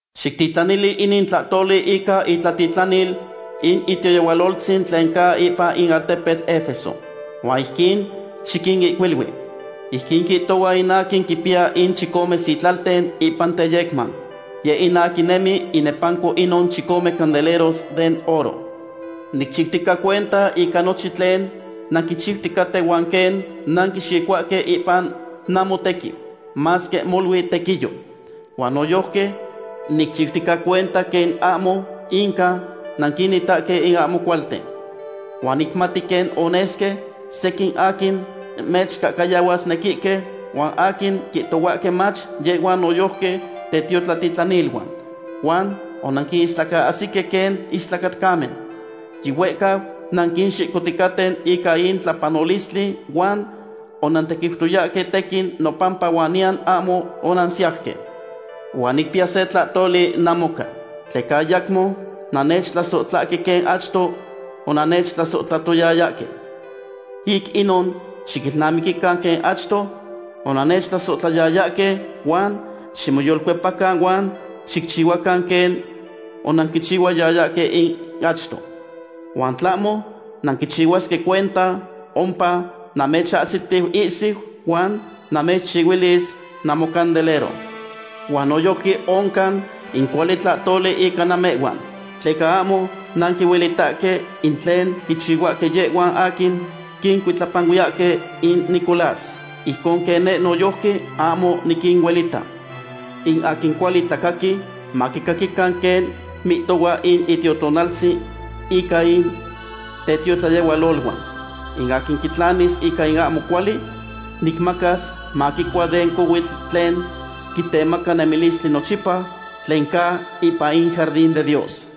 ’Xictitlanili inin tlahtoli ica itlatitlanil in itiotlayehualoltzin tlen ca ipan in altepetl Efeso. Huan ijquin xiquinihcuilui. Ijquin mihtohua in aquin quimpiya in chicome sitlalten ipan teyecman; yeh in aquin nemi inepanco inon chicome candeleros den oro: “Nicchiutica cuenta ica nochin tlen nanquichiuticaten huan quen nanquixicohuahque ipan namotequiu, masque molui tequiyo. Huan noyojqui nicchiutica cuenta quen ahmo inca nanquinitahque in ahmo cualten. Huan nicmati quen onesque sequin aquin mechcahcayahuasnequihque huan aquin quihtohuahque mach yehhuan noyojqui tetiotlatitlaniluan. Huan onanquinistlacaahsique quen istlacatcamen. Yihuehcau nanquixicohticaten ica in tlapanolistli huan onantequiutoyahque tequin nopampa huan niyan ahmo onansiauque. Huan nicpiya se tlahtoli namoca, tleca ayacmo nannechtlasohtlahque quen achto onannechtlasohtlayayahque. Ic inon xiquilnamiquican quen achto onannechtlasohtlayayahque, huan ximoyolcuepacan huan xicchihuacan quen onanquichihuayayahque in achto. Huan tlahmo nanquichihuasque cuenta, ompa namechahsitiu ihsiu huan namechcuilis namocandelero. Huan noyojqui oncan in cuali tlahtoli ica namehhuan, tleca ahmo nanquinuelitahque in tlen quichihuahque yehhuan aquin quicuitlapanuiyahque in Nicolás, ijcon quen neh noyojqui ahmo niquinuelita. In aquin cuali tlacaqui, maquicaquican quen mihtohua in Itiotonaltzin ica in tetiotlayehualoluan. In aquin quitlanis ica in ahmo cuali, nicmacas maquicua den cohuitl tlen quitemaca nemilistli nochipa, tlen ca ipan in jardin de Dios.”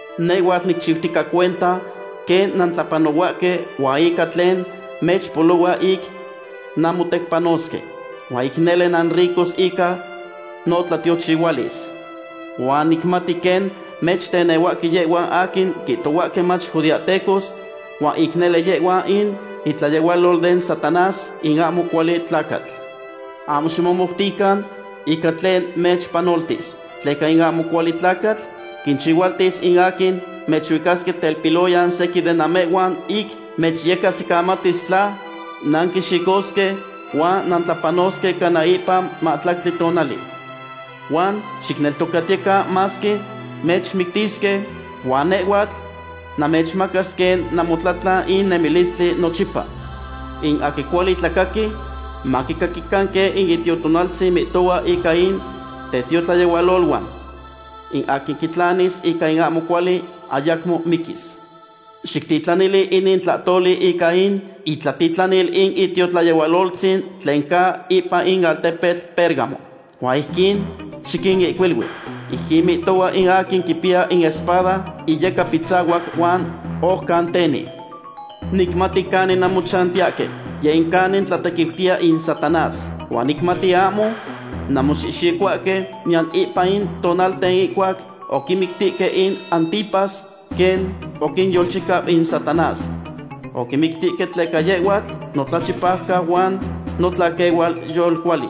Nehhuatl nicchiutica cuenta quen nantlapanohuahque huan ica tlen mechpolohua ic nanmotecpanosque. Huan ic nele nanricos ica notlatiochihualis. Huan nicmati quen mechtenehuahque yehhuan aquin quihtohuahque mach judeahtecos, huan ic nele yehhuan in itlayehualol den Satanás in ahmo cuali tlacatl. Ahmo ximomoutican ica tlen mechpanoltis, tleca in ahmo cuali tlacatl quinchihualtis in aquin mechuicasque telpiloyan sequin de namehhuan ic mechyecahsicamatis tla nanxihxicosque huan nantlapanosque cana ipan mahtlactli tonali. Huan xicneltocatiyecan masque mechmictisque, huan nehhuatl namechmacas quen namotlatlan in nemilistli nochipa. In aquin cuali tlacaqui, maquicaquican quen in Itiotonaltzin mihtohua ica in tetiotlayehualoluan. In aquin quitlanis ica in ahmo cuali ayacmo miquis.” ’Xictitlanili inin tlahtoli ica in itlatitlanil in itiotlayehualoltzin tlen ca ipan in altepetl Pérgamo. Huan ijquin xiquinihcuilui. Ijquin mihtohua in aquin quipiya in espada iyecapitzahuac huan ojcan teni: “Nicmati canin nanmochantiyahque, yeh in canin tlatequiutiya in Satanás. Huan nicmati ahmo nanmoxihxicohuahque, niyan ipan in tonalten ihcuac oquimictihque in Antipas, quen oquinyolchicau in Satanás. Oquimictihque tleca yehhuatl notlachipaucau huan notlaquehual yolcuali.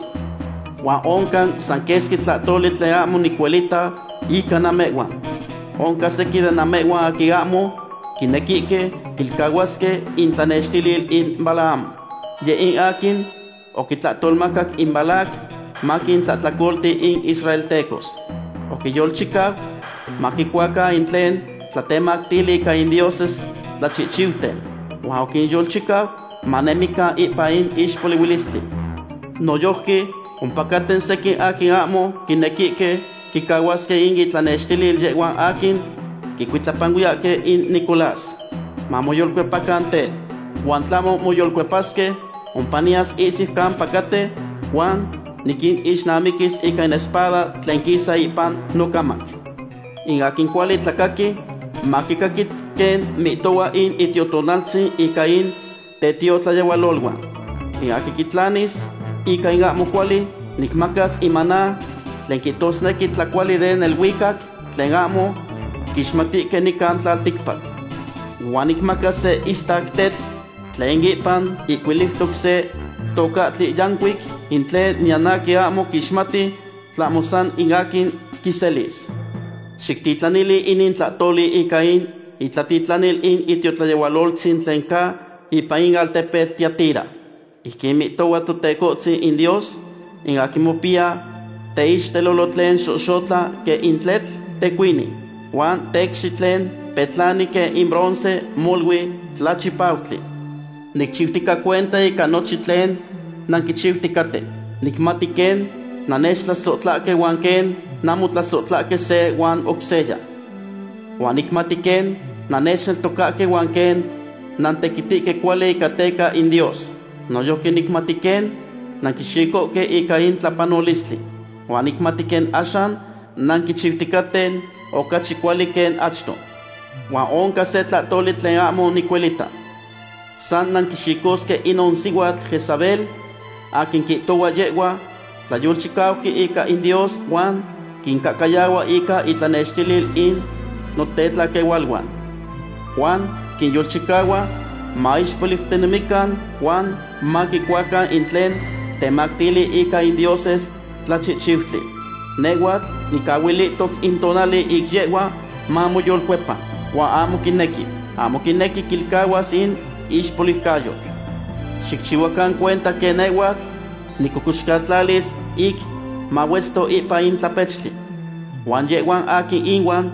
Huan oncan san quesqui tlahtoli tlen ahmo nicuelita ica namehhuan. Oncan sequin de namehhuan aquin ahmo quinequihque quilcahuasque itlanextilil in Balaam. Yeh in aquin oquitlahtolmacac in Balac maquintlahtlacolanalti in israeltecos. Oquinyolchicau maquicuacan in tlen tlatemactili ica in dioses tlachihchiuten. Huan oquinyolchicau manemican ipan in ixpolihuilistli. Noyojqui ompacaten sequin aquin ahmo quinequihque quicahuasque in itlanextilil yehhuan aquin quicuitlapanuiyahque in Nicolás. Mamoyolcuepacan tel. Huan tlahmo moyolcuepasque, ompa niyas ihsiu campa catehque huan niquinixnamiquis ica in espada tlen quisa ipan nocamac. In aquin cuali tlacaqui, maquicaqui quen mihtohua in Itiotonaltzin ica in tetiotlayehualoluan. In aquin quitlanis ica in ahmo cuali, nicmacas in maná tlen quihtosnequi tlacuali den neluicac tlen ahmo quixmatihque nican tlalticpac. Huan nicmacas se istac tetl tlen ipan ihcuiliutoc se tocahtli yancuic, in tlen niyan aquin ahmo quixmati, tlahmo san in aquin quiselis.” ’Xictitlanili inin tlahtoli ica in itlatitlanil in itiotlayehualoltzin tlen ca ipan in altepetl Tiatira. Ijquin mihtohua Teconetzin in Dios, in aquin mopiya teixtelolo tlen xohxotla quen in tletl tecuini, huan tecxi tlen petlani quen in bronce molui tlachipautli: “Nicchiutica cuenta ica nochin tlen nanquichiuticaten. Nicmati quen nannechtlasohtlahque huan quen nanmotlasohtlahque se huan oc seya. Huan nicmati quen nannechneltocahque huan quen nantequitihque cuali teca in Dios. Noyojqui nicmati quen nanquixicohque ica in tlapanolistli. Huan nicmati quen axan nanquichiuticaten ocachi cuali quen achto. Huan oncan se tlahtoli tlen ahmo nicuelita. San nanquixicosque inon sihuatl Jezabel aquin quihtohua yehhua tlayolchicauqui ica in Dios huan quincahcayahua ica itlanextilil in notlaquehualuan. Huan quinyolchicahua maixpoliucanemican huan maquicuacan in tlen temactili ica in dioses tlachihchiutli. Nehhuatl nicahuilihtoc in tonali ic yehhua mamoyolcuepa, huan ahmo quinequi. Ahmo quinequi quilcahuas in ixpoliucayotl. Xicchihuacan cuenta quen nehhuatl nicocoxcatlalis ic mahuetzto ipan in tlapechtli. Huan yehhuan aquin ihuan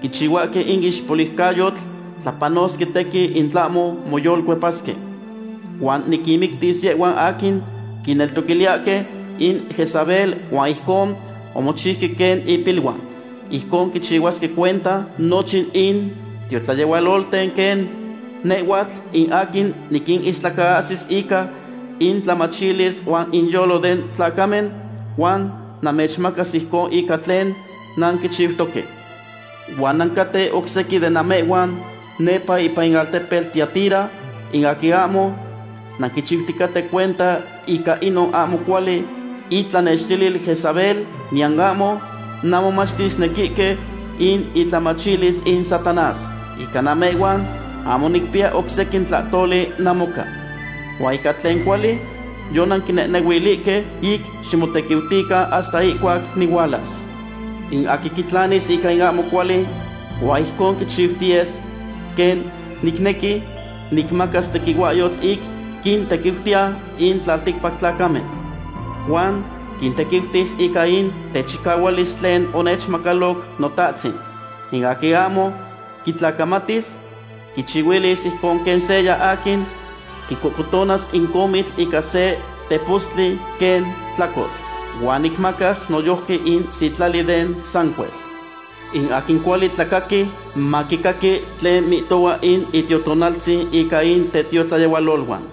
quichihuahque in ixpoliucayotl tlapanosque tequin in tlahmo moyolcuepasque. Huan niquinmictis yehhuan aquin quineltoquiliyahque in Jezabel huan ijcon omochiuque quen ipiluan. Ijcon quichihuasque cuenta nochin in tiotlayehualolten quen nehhuatl in aquin niquinistlacaahsi ica intlamachilis huan inyolo den tlacamen, huan namechmacas ijcon ica tlen nanquichiutoque. Huan nancaten oc sequin de namehhuan nepa ipan in altepetl Tiatira, in aquin ahmo nanquichiuticaten cuenta ica inon ahmo cuali itlanextilil Jezabel, niyan ahmo nanmomachtisnequihque in itlamachilis in Satanás. Ica namehhuan ahmo nicpiya oc sequin tlahtoli namoca. Huan ica tlen cuali yonanquinehnehuilihque, ic ximotequiutican hasta ihcuac nihualas. In aquin quitlanis ica in ahmo cuali huan ijcon quichiutiyes quen nicnequi, nicmacas tequihuahyotl ic quintequiutiya in tlalticpac tlacamen. Huan quintequiutis ica in techicahualis tlen onechmacaloc Notahtzin. In aquin ahmo quitlacamatis, quichihuilis ijcon quen seya aquin quicocotonas in comitl ica se tepostli quen tlacotl. Huan nicmacas noyojqui in sitlali den sancuel. In aquin cuali tlacaqui, maquicaqui tlen mihtohua in Itiotonaltzin ica in tetiotlayehualoluan.”